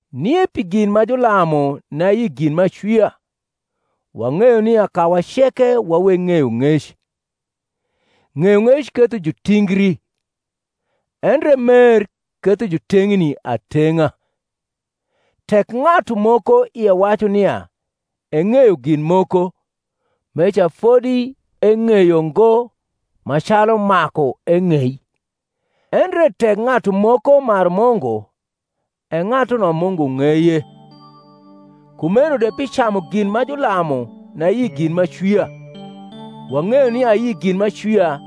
Nie pi gin ma julamu ni ayi gin m’acwia: wang’eyo nia kawa ceke wa weg ng’eyong’ec. Ng’eyong’ec ketho jutingri, endre mer ketho juteng’ni ateng’a. Tek ng’atu moko ie wacu nia eng’eyo gin moko, meca fodi eng’eyo ngo ma calu maku eng’ei; endre tek ng’atu moko maru Mungu, e ng’atuno Mungu ng’eye. Kumeno de pi camu gin ma julamu ni ayi gin m’acwia, wang’eyo nia ayi gin m’acwia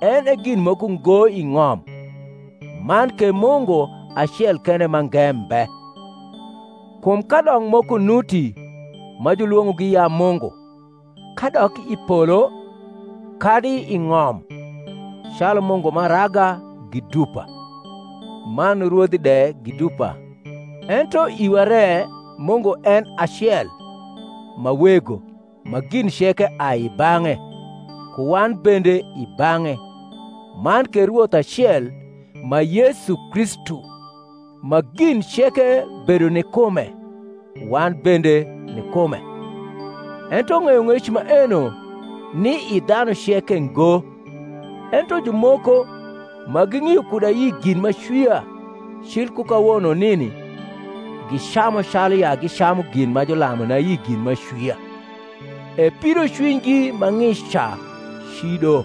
en e gin moko ngo i ng’om, man ke Mungu acel kende mange mbe. Kum kadok moko nuti ma julwong’ogi ya mungu, kadok i polo kadi i ng’om, calu mungu m’araga gi dupa, man rwodhi de gi dupa, ento iwa re Mungu en e acel, ma Wego, ma gin ceke ai i bang’e, ku wan bende i bang’e; man ke Rwoth acel, ma Yesu Kristu, ma gin ceke bedo ni kume, wan bende nikume. Ento ng’eyong’ec maeno ni i dhanu ceke ngo: ento jumoko, ma ging’io kud ayi gin m’acwia cil ku kawono nini, gicamu calu ya gicamu gin ma julamu ni ayi gin m’acwia; e pidocwinygi ma ng’ic ca cido.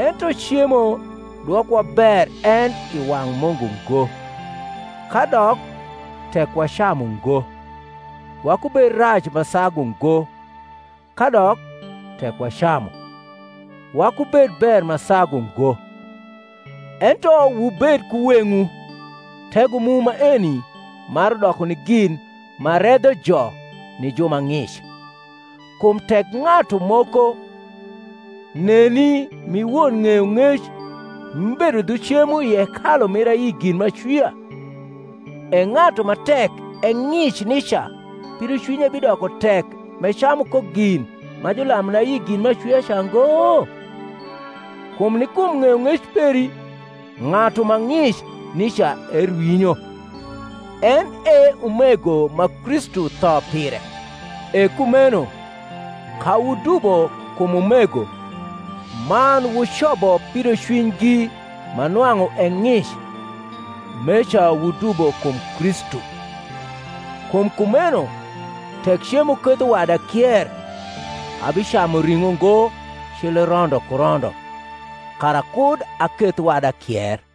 Ento cemo dwokowa ber en i wang’ Mungu ngo: kadok, tek wacamu ngo, wakubed rac ma sagu ngo; kadok, tek wacamu, wakubed ber ma sagu ngo. Ento wubed ku weng’wu tego mu maeni maru doko ni gin ma redho jo ni ju ma ng’ic; kum tek ng’atu moko neni m’i won ng’eyong’ec m’ibedo dhu cemo i hekalu mir ayi gin m’acwia, e ng’atu ma tek e ng’ic nica pidocwinye bidoko tek m’ecamu ko gin ma julamu ni ayi gin m’acwia ca ngo? Kum ni kum ng’eyong’ec peri ng’atu ma ng’ic nica erwinyo, en e umego ma Kristu tho pire. E kumeno, ka wudubo kum umego, man wucobo pidocwinygi ma nwang’u e ng’ic, meca wudubo kum Kristu. Kum kumeno, tek cemo ketho wada kier, abicamu ring’o ngo cil rondo ku rondo, kara kud aketh wada kier.